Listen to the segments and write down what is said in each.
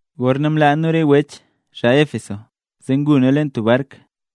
Gorna mlaa nu re wech, xaa Éfeso, zee ngu nu leen bark,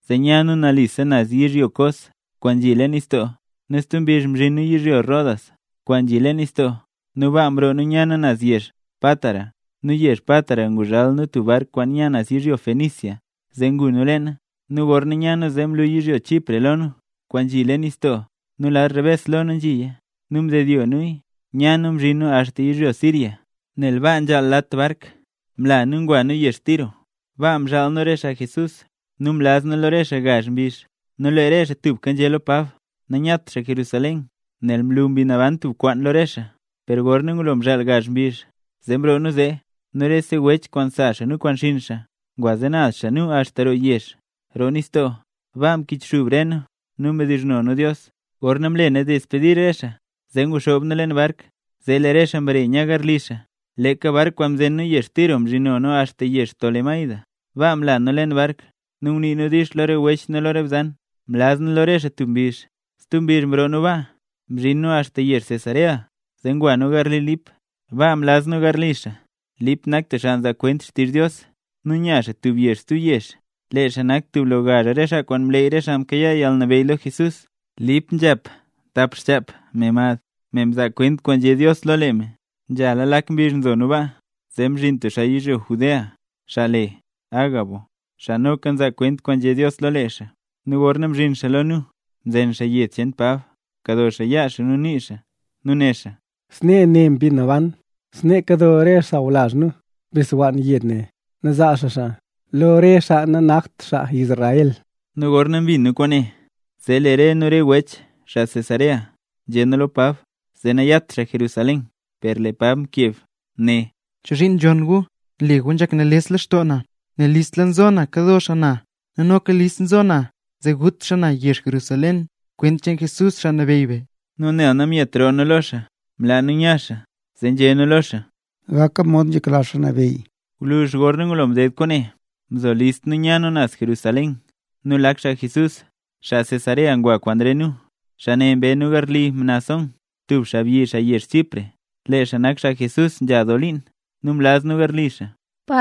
zee nya nu nalise naz yizhyo Cos, kwaan nzhi leen nistoo, nu stub mbizh mzhin nu yizhyo Rodas, kwaan nzhi leen nistoo nu baa mroo nu nya nu naz yezh Pátara. Nu yezh Pátara nguzhal nu tub bark kwaan nya naz yizhyo Fenicia, zee ngu nu leena. Nu gorna nya nu zee mlu yizhyo Chipre lo nu, kwaan nzhi leen nistoo, nu lad rebes lo nu nzhiya. Nu mdedyo nuya, nya nu mzhin nu axta yizhyo Siria. Nel nzhaal lat bark baa, mla nu ngwa nu yezh Tiro. Baa mzhaal nu re xaa Jesús, nu mlaz nu lo re xaa gazh mbizh. Nu lee re xaa tubka nzhé lo Pab nanyat xaa Jerusalén, nel mlu Mbi Naban tub kwaan lo re xaa. Per gorna ngulo mzhaal gazh mbizh, zee mroo nu zee, nu rese wech kwaan sa xaa nu kwaan xinn xaa ngwa zee naz xaa nu axta roo yezh, roo nistoo. Baa mkichxub re nu, nu mdizhno nu Dios. Gorna mle nu despedir re xaa zee nguxoob nu leen bark, zee lee re xaa mbare nya garli xaa. Leeka bark kwaan mzen nu yezh Tiro mzhino nu axta yezh Tolemaida. Baa mla nu leen bark nu ngunii nu “dix” lo re wech nu lo re bzan. Mlaz nu lo re xaa tub mbizh. Stub mbizh mroo nu baa, mzhin nu axta yezh Cesarea. Zee ngwa nu garli Lip, baa mlaz nu garli xaa. (Lip nak tub xaa nzaa kwent xtizh Dios, nu nya xaa tub yezh stub yezh. Lee xaa nak tub lo gazh re xaa kwaan mleey re xaa mkayaa yalnabeyy lo Jesús.) Lip nzhap tap xchap, me mad, me mzaa kwent kwaan nzhé Dios lo lee me. Nzhala lak mbizh nzo nu baa, zee mzhin tub xaa yizhyo Judea, xaa le Agabo, xaa noka nzaa kwent kwaan nzhé Dios lo lee xaa. Nu gorna mzhin xaa lo nu, mzen xaa yed cheen Pab, mkado xaaya yaa xaa nu nii xaa nu né xaa: —Snee né Mbi Naban: “Snee kado re sawlazh nu bixwann yed ne, nu zaa xaa xaa lo re xaa nanakt xaa Israel”. Nu gorna mbin nu kwaane, zee lee re nu nu re wech, xaa Cesarea, nzhé nu lo Pab zee nayat xaa Jerusalén. Per lee Pab mkeb né: —¿Chozhiin nzhonn gu, nle gu nzhak nales lextoo na? Nel listla nzo na kado xaa na nu noka listla na nzo zee gut xaa na yezh Jerusalén kwent cheen Jesús, Xaa Nabeyy be. Nu nel namyet roo nu lo xaa, mlaa nu nya xaa, zee nzhé nu lo xaa: —¡Gak mod nzhekla Xaa Nabeyy! Gwluzh gorna ngulo mded kwaane, mzo list nu nya nu naz Jerusalén. Nu lak xaa Jesús, xaa Cesarea ngwa kwaan re nu. Xaa ne mbe nu garli Mnasón, tub xaabyi xaa yezh Chipre. Lee xaa nak xaa Jesús nzha doo liin, nu mlaz nu garli xaa.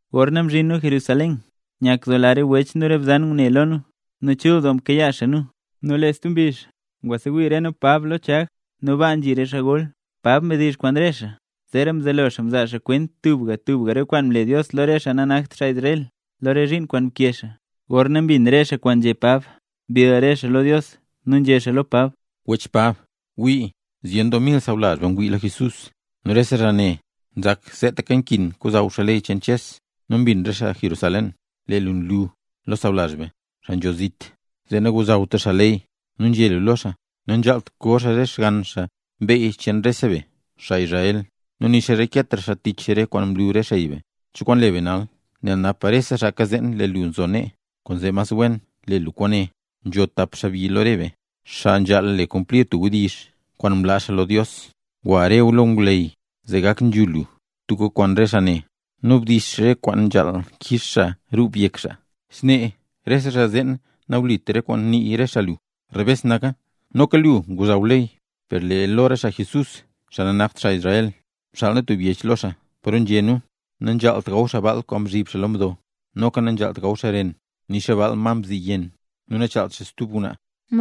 Gorna mzhin nu Jerusalén, nyakdoola re wech nu re bzan ngune lo nu, nu chul doo mkayaa xaa nu. Nu lee stub mbizh, ngwasewii re nu Pab lo Chag, nu baa nzhi rese xaa gol. Pab mdizh kwaan re xaa, zeera mzelo xaa mzaa xaa kwent tubga tubga re kwaan mle Dios lo re xaa nanakt xaa Israel lo re zhiin kwaan mkee xaa. Gorna mbin re xaa kwaan nzhé Pab, mbill re xaa lo Dios, nu nzhé xaa lo Pab: —Wech Pab, gwii. Zyen doo mil xaa sawlazh be ngwii lo Jesús, nu rese xaa ne nzak seetaka nkin kozhaw xaa ley cheen Ches. Nu mbin re xaa Jerusalén, lee lu nlu lo sawlazh be, xaa nzho zit, zee nagozhawtra xaa ley; nu nzhé lu lo xaa, nanzhaalt koo xaa re xgann xaa beyy cheen rese be, xaa Israel, nu nixa nareketra xaa tich re kwaan mlu re xey be. ¿Cho kwaan le be nal? Nel napa rese xaa kazeen lee lu nzo nee. Kwaanzee mas wen le lu kwaane: Nzho tap xaabyi lo re be, xaa nzhaal le kumplir tub wdizh kwaan mlaa xaa lo Dios. Gwa re gu xaa lo ngwleyy zee gak nzhul lu tubka kwaan re xaa ne, nu bdix re kwaan nzhaal kix xaa rub yek xaa. Snee rese xaa zeen nawlit re kwaan nii re xaa lu, rebes naka, noka lu ngozhaw ley. Per lee lo re xaa Jesús, xaa nanakt xaa Israel, mxaal nu tub yech lo xaa paro nzhé nu, nanzhaalt gaw xaa baal kwaan nzhib xaa lo mdo, noka nanzhaalt gaw xaa ren nixa baal ma mziyenn, nu nachaalt xaa stub ngwnaa.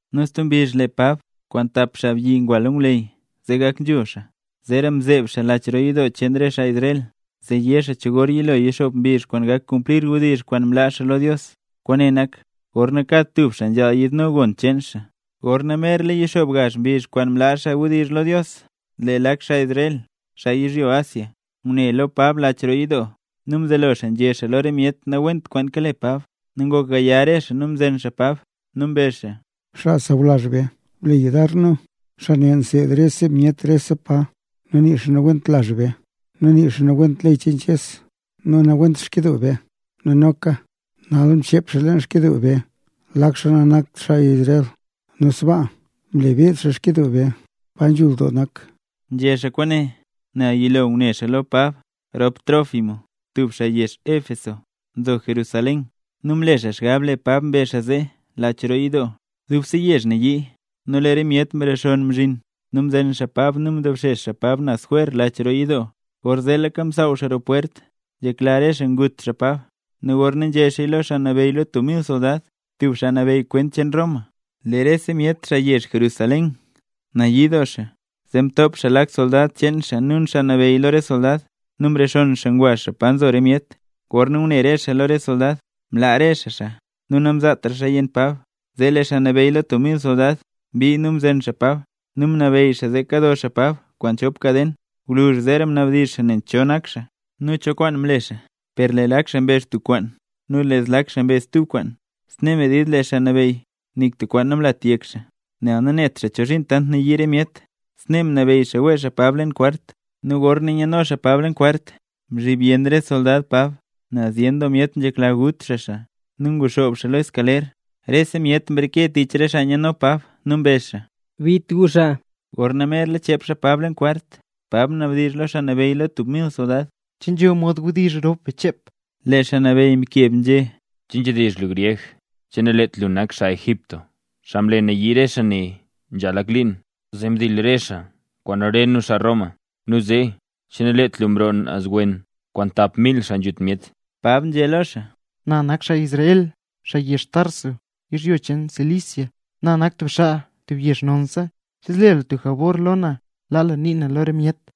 Nu stub mbizh Pab kwaan dap xaabyi ngwa lo ngwleyy zee gak nzhul xaa, zeera mzeeb xaa leen lach roo yidoo cheen re xaa Israel, zee yé xaa cho gor yilo yixoob mbizh kwaan gak kumplir wdizh kwaan mlaa xaa lo Dios, kwaane nak, gorna kad tub xaa nzhaal yiidno gon cheen xaa. Gorna merla yixoob gazh mbizh kwaan mlaa xaa wdizh lo Dios, lee lak xaa Israel, xaa yizhyo Asia, ngune lo Pab lo lach roo yidoo, nu mzelo xaa nzhé xaa lo re myet nawent kwaan kale Pab. Nu ngok gaya re xaa nu mzen xaa Pab, nu mbezh xaa: —¡Xaa sawlazh be, ble gu yudar nu! Xaa ne nseed rese myet rese pa, nu nii xaa nawent lazh be, nu nii xaa nawent ley cheen Ches nu nawent xkyidoo be. ¡Nu noka, nal mchep xaa leen xkyidoo be lak xaa nanakt xaa Israel, nu sbaa mle beed xaa yidoo cheen be, pa nzhul doo nak! Nzhé xaa kwaane nel yilo ngune xaa lo Pab rop Trófimo, tub xaa yezh Éfeso, nzo Jerusalén, nu mle xaa xgab lee Pab mbe xaa xaa leen lach roo yidoo. Dubse yezh nayii, nu lee re myet mrexonn mzhin. Nu mzen xaa Pab nu mdobxex xaa Pab naz jwer lach roo yidoo, gorzeetlaka msaaw xaa roo pwert. Nzhekla re xaa gut xaa Pab. Nu gorna nzhé xaaya lo xaa nabeyy lo tub mil soldad, tub xaa nabeyy kwent cheen Roma, lee rese myet xaa yezh Jerusalén nayii doo xaa. Zee lee xaa mtop lak soldad cheen xaa nu lak xaa nabeyy lo re soldad, nu mrexonn xaa ngwa xaa pa nzo re myet. Gorna ngune re xaa lo re soldad, mlaa re xaa, nu namzaatra xaaya yenn Pab. Zee lee xaa nabeyy lo tub mil soldad mbii nu mzen Pab nu mnabeyy xaa zee kado xaa Pab kwaan chop kaden. Gwluzh zeera mnabdizh xaa nen cho nak xaa, nu cho kwaan mle xaa. Per lee lak xaa mbezh tub kwaan nu lee zlak xaa mbezh stub kwaan, snee medid lee xaa nabeyy nik tub kwaan namlat yek xaa, nel nanet xaa ne chozhiin tant nayii re myet. Snee mnabeyy xaa wee xaa Pab leen kwart. Nu gorna nyano xaa Pab leen kwart, mzhib yenn re soldad Pab, nel zyen doo myet nzhekla gut xaa xaa. Nu nguxoob xaa lo escaler. Rese myet mreke tich re xaa nyano Pab nu mbezh xaa: —¡Bit gu xaa! Gorna merla chep xaa Pab leen kwart, Pab mnabdizh lo xaa nabeyy lo tub mil soldad: —¿Che nzho mod wdizh rop be chep? Lee xaa nabeyy mkeb nzhé: —¿Che nzhidizh lu gryeg? ¿Che naleet lu xaa Egipto, xaa mle nayii re xaa nee nzha lak liin, zee mdil re xaa kwaan re nu, xaa Roma? Nu zee, ¿che naleet lu mroo naz wen kwaan tap mil xaa nzhut myet? Pab nzhé lo xaa: —Na nak xaa Israel, xaa yezh Tarso, yizhyo cheen Cilicia. Na nak tub xaa tub yezh nonsa. ¿Che zle lu jabor lo na, laa nii na lo re myet?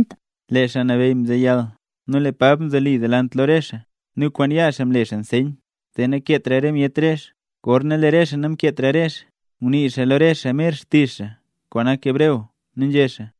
Lee xaa nabeyy mzeyal. Nu lee Pab mzoli delant lo re xaa nu kwaan yaa xaa mle xaa nseyn, zee nakeetra re myet rezh. Gorna lee re xaa namkeetra rezh, ngunii xaa lo re xaa mer xtizh xaa kwaan nak hebreo. Nu nzhé xaa: